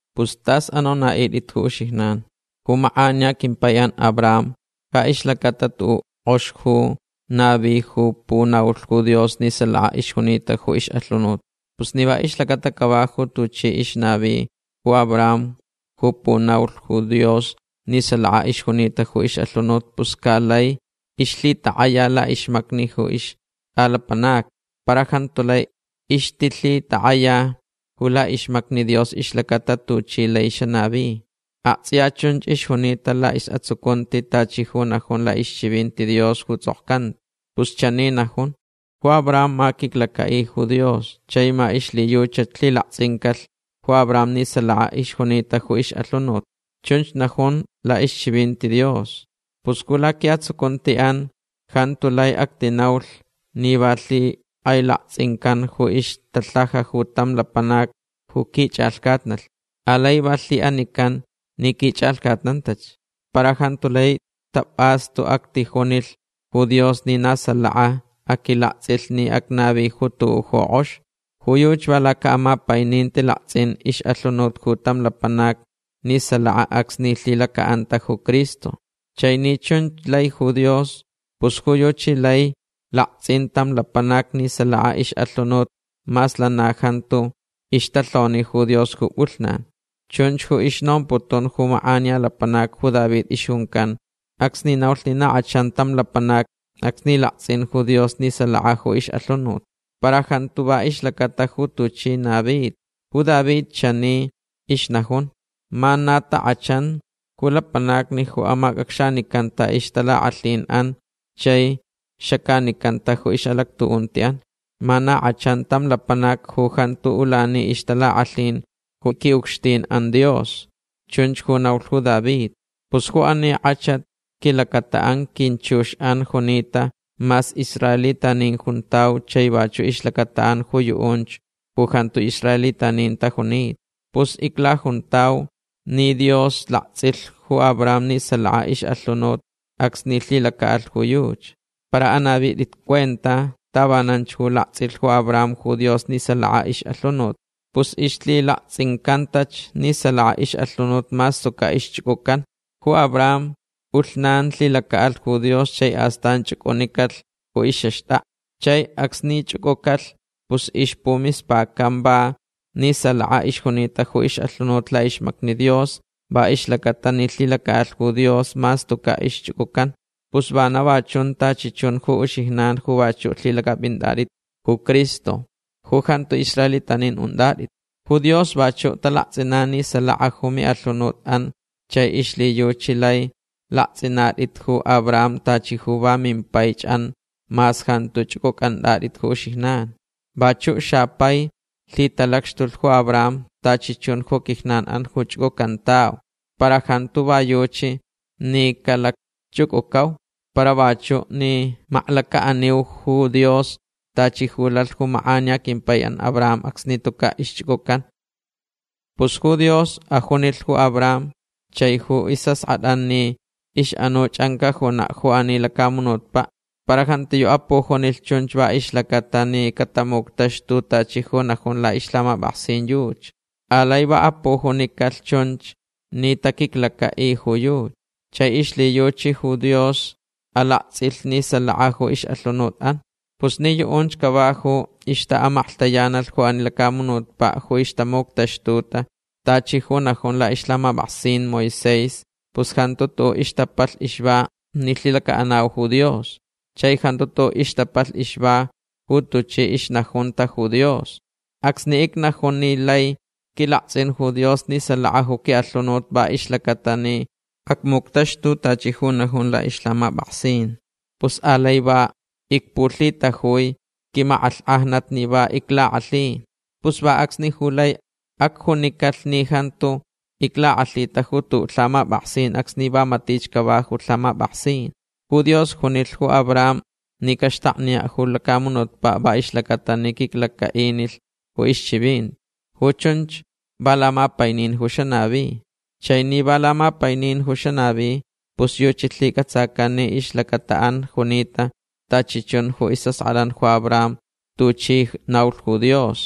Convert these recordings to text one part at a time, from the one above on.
Pus tas anonaʼitʼit ju uxijnan. Ju makʼaniya quimpaiʼan Abraham ja ixlacata tuʼuʼ kʼox ju navilhch ju punaulh ju Dios ni salaka ixjunita ju ixʼalhunut. Pus ni va ixlacata cava ju tuchi ixnavich ju Abraham ju punaulich ju Dios ni salaka ixjunita ju ixʼalhunut pus ca laich ixlhitakʼayalh laʼixmacni ju ixtʼaʼlapanacni. Para jantu lai ixtilhitakʼaya ju laʼixmacni Dios ixlacatach tuchi laich xanavi. Aktsʼiya chunch ixjunita laʼisʼatsucunti tachi ju najun laʼixchivinti Dios ju tsʼokcanta. Pus chani najun: “Ju Abraham ma quiclacaʼilh ju Dios chai ma ixlhiyuchach lhilaktsʼincalh ju Abraham ni salaka ixjunita ju ixʼalhunut”. Chunch najun laʼixchivinti Dios. Pus ju laquiʼatsucuntiʼan jantu lai actinaulh ni va lhikʼailaktsʼincan ju ixtalhaja ju tam lapanac ju quichʼalhcatnalh. Alai va lhiʼanican ni quichʼalhcatnantach. Para jantu lai tapʼastu actijunilh ju Dios ni na salakach aquilaktsʼilh ni acnavilh ju tuʼuʼ ju kʼox. Ju yuchi va lacaʼamapaininti laktsʼin ixʼalhunut ju tam lapanac ni salaka acsni lhilacaʼanta ju Cristo. Chai ni chunch lai ju Dios pus ju yuchi lai laktsʼin tam lapanac ni salaka ixʼalhunut mas lana jantu ixtalhoni ju Dios ju pʼulhnan. Chunch ju ixnomputun ju makʼaniya lapanac ju David ixjuncan acsni naulh ni na kʼachan tam lapanac acsni laktsʼin ju Dios ni salaka ju ixʼalhunut. Para jantu va ixlacata ju tuchi navitach. Ju David chani ixnajun: Ma na takʼachanch ju lapanacni ju amacʼacxanicanta ixtalakʼalhinʼan chai xacanicanta ju ixʼalactuʼuntiʼan. Ma na kʼachanch tam lapanac ju jantuch ulani ixtalakʼalhin ju quiʼucxtinʼan Dios. Chunch ju naulh ju David. Pus ju ani kʼachat quilacataʼan quinchuxʼan junita mas israelitanin juntau chai vachuʼ ixlacataʼan ju yuʼunch ju jantu israelitanin tajunita. Pus iclajuntau ni Dios laktsʼilh ju Abraham ni salaka ixʼalhunut acsni lhilacaʼalh ju yuchi. Para anavitʼit cuenta tavananch ju laktsʼilh ju Abraham ju Dios ni salaka ixʼalhunut. Pus ixlhilaktsʼincantach ni salaka ixʼalhunut mas tucaʼ ixchʼucʼucanta. Ju Abraham pʼulhnan lhilacaʼalh ju Dios chai astan chʼucʼunicalh ju ixʼaxtʼakʼa. Chai acsni chʼucʼucalh pus ixpumispacanch va ni salaka ixjunita ju ixʼalhunut laʼixmacni Dios va ixlacaʼatalh ni lhilacaʼalh ju Dios mas tucaʼ ixchʼucʼucanta. Pus vana va chun tachi chun ju uxijnan ju vachuʼ lhilacʼapʼinatʼit ju Cristo ju jantu israelitanin untʼatʼit. Ju Dios vachuʼ talaktsʼinan ni salaka ju miʼalhunutʼan chai ixlhiyuchi lai laktsʼinatʼit ju Abraham tachi ju va mimpaichʼan mas jantu chʼucʼucʼantʼatʼit ju uxijnan. Vachuʼ xapaich lhitalacxtulh ju Abraham tachi chun ju quijnanʼan ju chʼucʼucantauch. Para jantu va yuchi ni calacchʼucʼucauch. Para vachuʼ ni maklacaʼaniu ju Dios tachi ju lalhch ju makʼaniya quimpaiʼan Abraham acsni tucaʼ ixchʼucʼucanta. Pus ju Dios ajunilh ju Abraham chai ju isʼaskʼatʼan ni ixʼanuchʼan cajunaʼ ju ani lacamunutpaʼ. Para jantiyuʼ apujunicalh chunch va ixlacaʼatalh ni tamuctaxtulh tachi ju najun laʼixlhamapʼaksin yuchi. Alai va apujunicalh chunch ni taquiclacaʼilh ju yuchi. Chai ixlhiyuchi ju Dios alaktsʼilh ni salaka ju ixʼalhunutʼan. Pus ni yuʼunch cava ju ixtaʼamaklhtayanalh ju ani lacamunutpaʼ ju ixtamuctaxtuta tachi ju najun laʼixlhamapʼaksin Moisés pus jantu tuʼuʼ ixtapalh ixva ni lhilacaʼanau ju Dios. Chai jantu tuʼuʼ ixtapalh ixva ju tuchi ixnajuntach ju Dios. Acsni icnajun ni laich quilaktsʼin ju Dios ni salaka ju quiʼalhunut va ixlacaʼatalh ni acmuctaxtulh tachi ju najun laʼixlhamapʼaksin pus alai va icpulhitajui quimakʼalhkʼajnat ni va iclakʼalhi. Pus va acsnich ju lai acjunicalh ni jantu iclakʼalhita ju tuʼuʼ lhamapʼaksin acsni va matich cava ju lhamapʼaksin. Ju Dios junilh ju Abraham ni caxtakniyaʼ ju lacamunutpaʼ va ixlacata ni quiclacaʼinilh ju ixchivinti. Ju chunch va lamapainin ju xanavi. Chai ni va lamapainin ju xanavi pus yuchi lhicʼatsacan ni ixlacataʼan junita tachi chun ju isʼaskʼatʼan ju Abraham tuchi naulh ju Dios.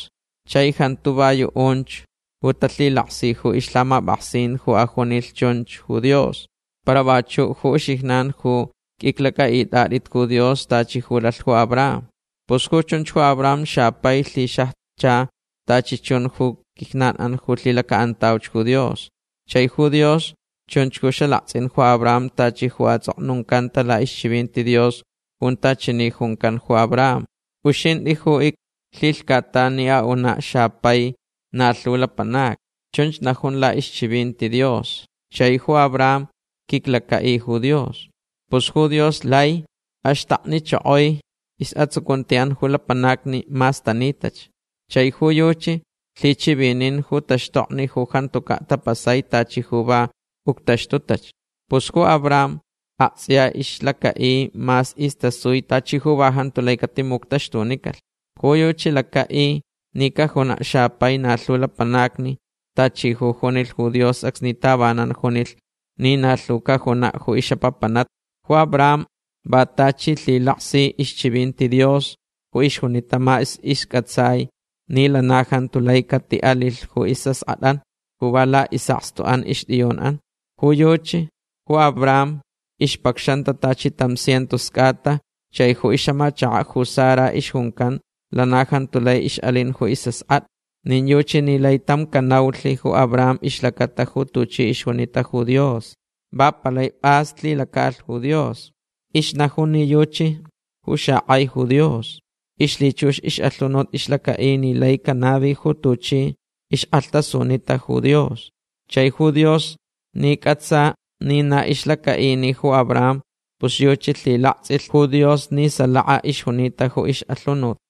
Chai jantu va yuʼunch ju talhilaksi ju ixlhamapʼaksin ju ajunilh chunch ju Dios. Para vachuʼ ju uxijnan ju qʼuiclacʼaʼitʼatʼit ju Dios tachi ju lalh ju Abraham. Pus ju chunch ju Abraham xapai lhixajcha tachi chun ju quijnanʼan ju lhilacaʼantauch ju Dios. Chai ju Dios chunch ju xalaktsʼin ju Abraham tachi ju atsʼoknuncanta laʼixchivinti Dios junta chani juncan ju Abraham: “Uxintʼi ju iclhilhcatan ni unaʼ xapai na lhu lapanacni”. Chunch najun laʼixchivinti Dios. Chai ju Abraham quiclacaʼilh ju Dios. Pus ju Dios lai axtaknichokoi ju isʼatsucuntiʼan ju lapanacni mas tanitach. Chai ju yuchi lhichivininch ju taxtokni ju jantucaʼ tapasai tachi ju va uctaxtutach. Pus ju Abraham aktsʼiya ixlacaʼi mas istasui tachi ju va jantu lai catimuctaxtunicalh. Ju yuchi lacaʼilh ni cajunaʼ xapai na lhu lapanacni tachi ju junilh ju Dios acsni tavanan junilh ni na lhu cajunaʼ ju ixʼapapanatnich. Ju Abraham va tachi lhilaksilh ixchivinti Dios ju ixjunita mas iscʼatsai ni lana jantu lai catiʼalilh ju isʼaskʼatʼaʼan ju va laʼisʼakstuʼan ixtʼiyunʼan. Ju yuchi ju Abraham ixpacxanta tachi tam cientos cʼata chai ju ixʼamachakaʼ ju Sara ixjuncan lana jantu lai ixʼalin ju isʼaskʼatʼa. Nin yuchi ni lai tam canaulh ju Abraham ixlacata ju tuchi ixjunita ju Dios. Va palai pʼas lhilacaʼalh ju Dios. Ixnajunch ni yuchi ju xakʼai ju Dios. Ixlhichux ixʼalhunut ixlacaʼi ni laich canavi ju tuchi ixkʼalhtasunitach ju Dios. Chai ju Dios ni cʼatsalh ni na ixlacaʼinich ju Abraham pus yuchi lhilaktsʼilh ju Dios ni salaka ixjunita ju ixʼalhunut.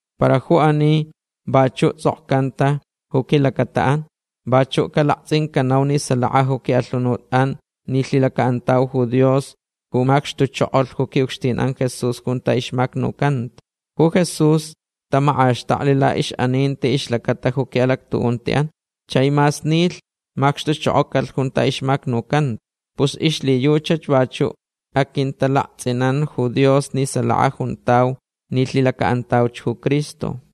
Para ju ani vachuʼ tsʼokcanta ju quilacataʼan. Vachuʼ calaktsʼincanau ni salaka ju quiʼalhunutʼan ni lhilacaʼanauch ju Dios ju macxtuchokolh ju quiʼucxtinʼan Jesús junta ixmacnucanta. Ju Jesús tamakʼaxtakli laʼixʼaninti ixlacata ju quiʼalactuʼuntiʼan. Chai mas nilh macxtuchokocalh junta ixmacnucanta. Pus ixlhiyuchach vachuʼ aquintalaktsʼinan ju Dios ni salaka juntau ni lhilacaʼanau ju Cristo.